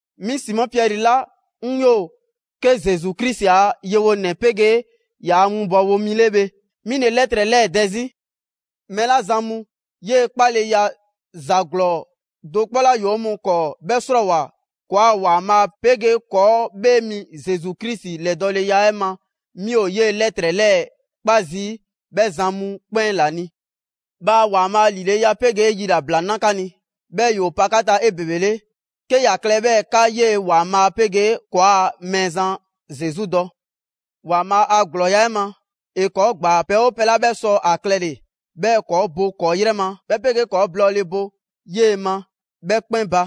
'Mi Simɔ Piɛri 'la 'ŋ 'yoo‑ 'ke Zesu Krisi a yewonɛ 'pegee ‑yaa' winbɔwo mi 'le bhe, 'mi ‑le 'lɛtrɛ 'lɛɛ‑ dɛ 'zi. 'Mɛɛ 'la zan mu 'yee‑ 'kpaleya ‑za ‑glɔɔ do 'kpɔ 'la ‑yoo 'o mɔɔ 'kɔɔ 'bhɛ 'srɔɔwoa‑ ‑kɔɔa' ‑Waanbhaa' 'pegee ‑kɔɔ' 'Bhee Mi Zesu Krisi 'lɛdɔɔleya 'ɛ ma, 'mi ‑o 'yee‑ 'lɛtrɛ 'lɛɛ‑ 'kpa zii' 'bhɛ zan mu 'kpɛn ‑la ni. Bhaa ‑Waanbhaa' ‑lileya 'pegee yilabla na 'ka ni 'bhɛɛ‑ ‑yoo pa 'ka ta 'ebebele, 'ke ‑ya klɛ 'bhɛɛ‑ 'ka 'yee‑ ‑Waanbhaa' 'pegee ‑kɔɔa' Mɛɛzan Zesu dɔ! ‑Waanbhaa' a ‑glɔɔya' 'ɛ ma, ‑e ‑kɔɔ' ‑gbaa pɛ 'oo pɛ 'la 'bhɛ sɔ ‑a klɛle‑ 'bhɛɛ‑ ‑kɔɔ' bo ‑kɔɔ' 'yrɛ ma, 'bhɛ 'pegee ‑kɔɔ' blɔɔle bo 'yee‑ ma, 'bhɛ 'kpɛn ba.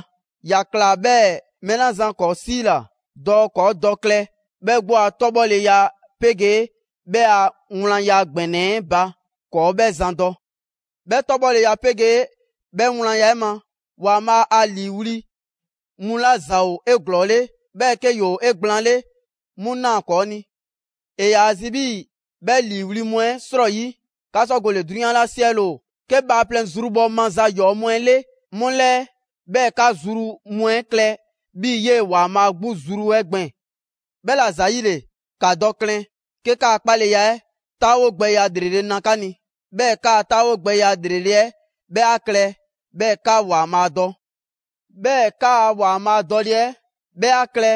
‑Ya ꞊kla, 'bhɛɛ‑ mɛɛ 'la zan ‑kɔɔ' 'siila‑ dɔɔ ‑kɔɔ' dɔ klɛ 'bhɛ 'gbu a 'tɔbhɔleya 'pegee 'bhɛ a wlanya ‑gbɛnɛ 'ɛ ba ‑kɔɔ' 'bhɛ zan dɔ. 'Bhɛ 'tɔbhɔleya 'pegee 'bhɛ wlanya 'ɛ ma, ‑Waanbhaa' 'a 'liiwli‑ mu 'la ‑za ‑o 'eglɔɔle, 'bhɛɛ‑ 'ke ‑woo 'egblaanle 'mu ꞊naa ‑kɔɔ' ni. ‑E ‑yaa zi 'bhii‑ 'bhɛ ‑liiwli' mu 'ɛ 'srɔyi 'ka sɔ gole‑ 'drunyan 'la 'siɛle‑ ‑o 'ke bhaaplɛŋ zrubhɔ ma ‑za ‑yɔɔ' mu 'ɛ 'le 'mu 'lɛɛ, 'bhɛɛ‑ 'ka zru mu 'ɛ klɛ 'bhii‑ 'yee‑ ‑Waanbhaa' 'gbu zru 'ɛ gbɛɛn‑. 'Bhɛla‑ ‑zayile, ‑ka dɔ klɛn 'ke 'ka 'kpaleya 'ɛ 'taawogbɛya ‑lrele' na 'ka ni, 'bhɛɛ‑ 'ka 'taawogbɛya ‑lrele' 'ɛ 'bhɛ 'a klɛ 'bhɛɛ‑ 'ka ‑Waanbhaa' dɔ; 'bhɛɛ‑ 'kaa‑ ‑Waanbhaa' dɔle 'ɛ 'bhɛ 'a klɛ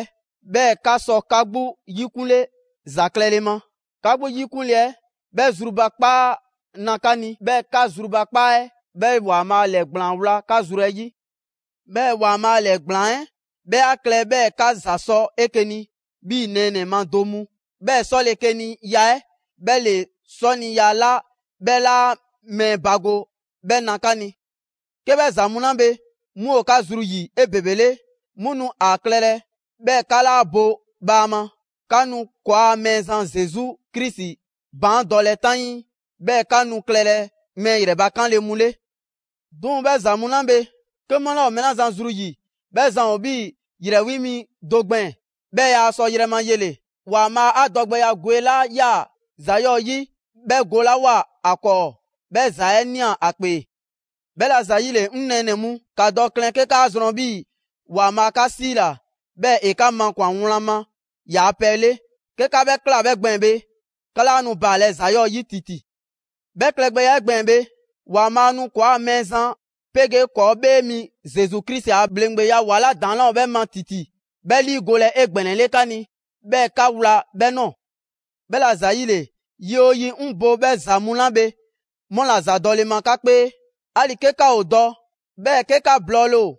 'bhɛɛ‑ 'ka sɔ 'ka 'gbu 'yikunle ‑za klɛle ma. 'Ka 'gbu 'yikunle 'ɛ 'bhɛ zrubakpaa na 'ka ni, 'bhɛɛ‑ 'ka zrubakpaa 'ɛ 'bhɛ ‑Waanbhaa' ‑lɛɛgblaan wla 'ka zru 'ɛ 'yi. 'Bhɛɛ‑ ‑Waanbhaa' ‑lɛɛgblaan 'ɛ 'bhɛ 'a klɛ 'bhɛɛ‑ 'ka ‑za sɔ 'eke‑ ni 'bhii‑ nɛɛnɛ‑ ma do mu; 'bhɛ 'sɔlekeniya 'ɛ 'bhɛ ‑le 'sɔniya 'la 'bhɛ 'laa mɛɛ bago 'bhɛ na 'ka ni. 'Ke 'bhɛ ‑za mu 'la bhe 'mu ‑o 'ka zru 'yi 'ebebele, 'mu nu ‑a klɛlɛ 'bhɛɛ‑ 'ka 'laa bo bhaama; 'ka nu ‑kɔɔa' Mɛɛzan Zesu Krisi baandɔlɛ 'taŋii, 'bhɛɛ‑ 'ka nu klɛlɛ mɛɛ ‑yrɛbakanle mu 'le. 'Duŋ‑ 'bhɛ ‑za mu 'la bhe, 'ke 'mu 'laa ‑o mɛɛ 'la zan zru ‑yi, 'bhɛ zan ‑o 'bhii‑ ‑yrɛ 'wi mi do gbɛɛn‑, 'bhɛɛ‑ yaa sɔ yrɛ ma yele‑. ‑Waanbhaa' 'a dɔgbɛya gwe 'la 'yaa‑ ‑za 'yɔɔ‑ 'yi 'bhɛ golawoa ‑a 'kɔɔ, 'bhɛ ‑za 'ɛ ꞊nia ‑a 'kpee. 'Bhɛla‑ ‑zayile, 'ŋ nɛɛnɛ‑ mu, ‑ka dɔ klɛn 'ke 'kaa zrɔn 'bhii‑ ‑Waanbhaa' 'ka 'siila‑, 'bhɛɛ‑ ‑e 'ka makwan‑ wlan ma yaa pɛ 'le. 'Ke 'ka 'bhɛ ꞊kla, 'bhɛ gbɛɛn‑ bhe, 'ka 'laa nu baalɛ ‑za 'yɔɔ‑ yi ‑titi. 'Bhɛ klɛgbɛya 'ɛ gbɛɛn‑ bhe, ‑Waanbhaa' nu ‑kɔɔa' Mɛɛzan 'pegee ‑kɔɔ' 'Bhee mi Zesu Krisi ‑a ‑bhleŋgbeya ‑wa 'la ‑daŋ' 'laa ‑o 'bhɛ ma ‑titi, 'bhɛ 'liigolɛ 'egbɛnɛle 'ka ni, 'bhɛɛ‑ 'ka wla 'bhɛ nɔɔ‑. 'Bhɛla‑ ‑zayile, yi 'oo yi, 'ŋ bo 'bhɛ ‑za mu 'la bhe 'mu ‑la ‑za dɔle ma 'ka 'kpee, 'ali‑ 'ke 'ka ‑o dɔ, 'bhɛɛ‑ 'ke 'ka blɔɔle ‑o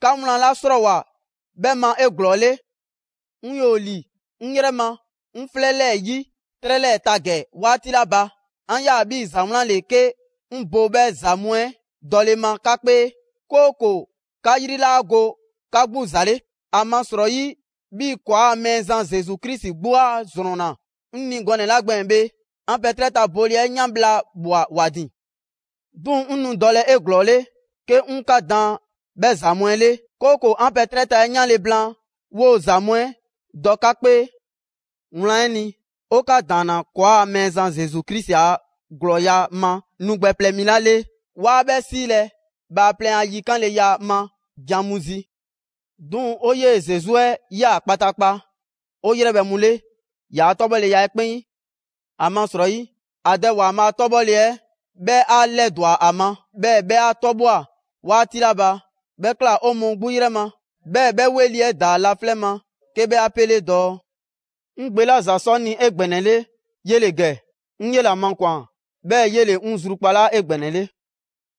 'ka wlan 'la 'srɔɔwoa‑ 'bhɛ ma 'eglɔɔle. 'Ŋ 'yoo‑ ‑li 'ŋ 'yrɛ ma 'ŋ 'flɛ 'lɛɛ‑ 'yi 'trɛ 'lɛɛ‑ ta ‑gɛ 'waati 'la ba, 'an ꞊ya 'bhii‑ ‑za wlan 'le 'ke 'ŋ bo 'bhɛ ‑za mu 'ɛ dɔle ma 'ka 'kpee, 'kooko‑ 'ka 'yri 'laa go 'ka 'gbu ‑za 'le, ‑amasrɔyi, 'bhii‑ ‑kɔɔa' Mɛɛzan Zesu Krisi 'gbu 'a ‑zrɔnna 'ŋ ni gɔnɛ‑ 'la gbɛɛn‑ bhe, 'an pɛ 'trɛ ta bole 'ɛ 'yan bhla ꞊bhwa ‑wa ‑din. 'Duŋ‑, 'ŋ nu dɔlɛ 'eglɔɔle 'ke 'ŋ 'ka daan 'bhɛ ‑za mu 'ɛ 'le, 'kooko‑ 'an pɛ 'trɛ ta 'ɛ 'yanle‑ blaan, 'woo‑ ‑za mu 'ɛ dɔ 'ka 'kpee. Wlan 'ɛ ni, 'o 'ka ‑daanna ‑kɔɔa' Mɛɛzan Zesu Krisi a ‑glɔɔya' ma nu gbɛ plɛ mi 'ɛ 'la 'le, 'waa 'ɛ bhɛ 'silɛ‑ bhaaplɛŋ a yikanleya ma can mu zi. 'Duŋ‑ 'o 'yee Zesu 'ɛ ꞊ya kpataakpa 'o 'yrɛbhɛ‑ mu 'le ‑yaa' 'tɔbhɔleya 'ɛ 'kpɛn 'yi. ‑Amasrɔyi, ‑a Dɛ ‑Waanbhaa' 'tɔbhɔle 'ɛ 'bhɛ 'a 'lɛdwa‑ ‑a ma, 'bhɛɛ‑ 'bhɛ 'a 'tɔbhwa‑ 'waati 'la ba, 'bhɛ ꞊kla 'o mɔɔ 'gbu 'yrɛ ma, 'bhɛɛ‑ 'bhɛ 'weli‑ 'ɛ ‑daa laflɛ' ma 'ke 'bhɛ 'a 'pele dɔɔ: «'Ŋ Gbe 'la ‑za sɔ 'ŋ ni 'egbɛnɛle, 'yele‑ ‑gɛ; 'ŋ 'yela‑ makwan‑ 'bhɛɛ‑ 'yele‑ 'ŋ zrukpalaa 'egbɛnɛle.»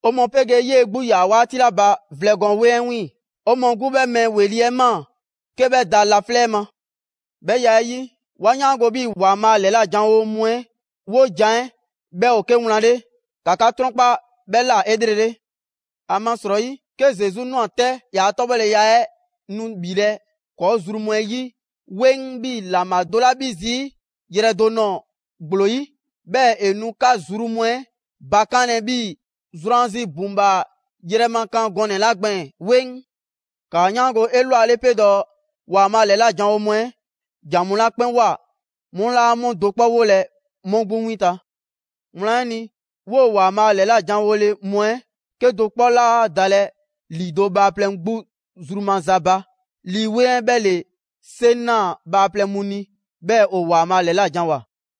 'O mɔɔ 'pegee 'yee‑ 'gbu 'yaa‑ 'waati 'la ba vlɛ gɔɔn 'weŋ 'ɛ 'wiiŋ‑, 'o mɔɔ 'gbu 'bhɛ mɛɛ ‑weli' 'ɛ ꞊maa 'ke 'bhɛ da laflɛ' ma. 'Bhɛ ya 'ɛ 'yi, 'wa 'yaango‑ 'bhii‑ ‑Waanbhaa' ‑lɛlajanwo mu 'ɛ 'wojan‑ 'ɛ 'bhɛ ‑o 'ke wlan 'le. ‑Ka 'ka 'trɔnkpa 'bhɛ ꞊la 'elrele. ‑Amasrɔyi, 'ke Zesu ꞊nwa 'tɛ ‑yaa' 'tɔbhɔleya 'ɛ nu ‑bhilɛ' ‑kɔɔ' zru mu 'ɛ 'yi 'weŋ 'bhii‑ ‑laŋbha do 'la 'bhi zii' yrɛ do nɔɔ‑ ‑gblo 'yi, 'bhɛɛ‑ ‑e nu 'ka zru mu 'ɛ bakanlɛ 'bhii‑ zrwanzi ‑buŋbhaa yrɛ ma kan gɔnɛ‑ 'la gbɛɛn‑ 'weŋ. ‑Kaa 'yaango‑ 'elwale 'pe dɔɔ: ‑Waanbhaa' ‑lɛlajanwo mu 'ɛ ‑jan mu 'la 'kpɛn ꞊woa, 'mu 'laa 'mu do 'kpɔ 'wolɛ‑ 'mu 'gbu 'winta‑. Wlan 'ɛ ni, 'woo‑ ‑Waanbhaa' ‑lɛlajanwole mu 'ɛ 'kedo‑ 'kpɔ 'laa dalɛ ‑lido' bhaaplɛŋ 'gbu zru maza ba, Lii 'Weŋ 'ɛ 'bhɛ ‑le 'seŋ ꞊naa bhaaplɛŋ mu ni, 'bhɛɛ‑ ‑o ‑Waanbhaa ‑lɛlajanwoa.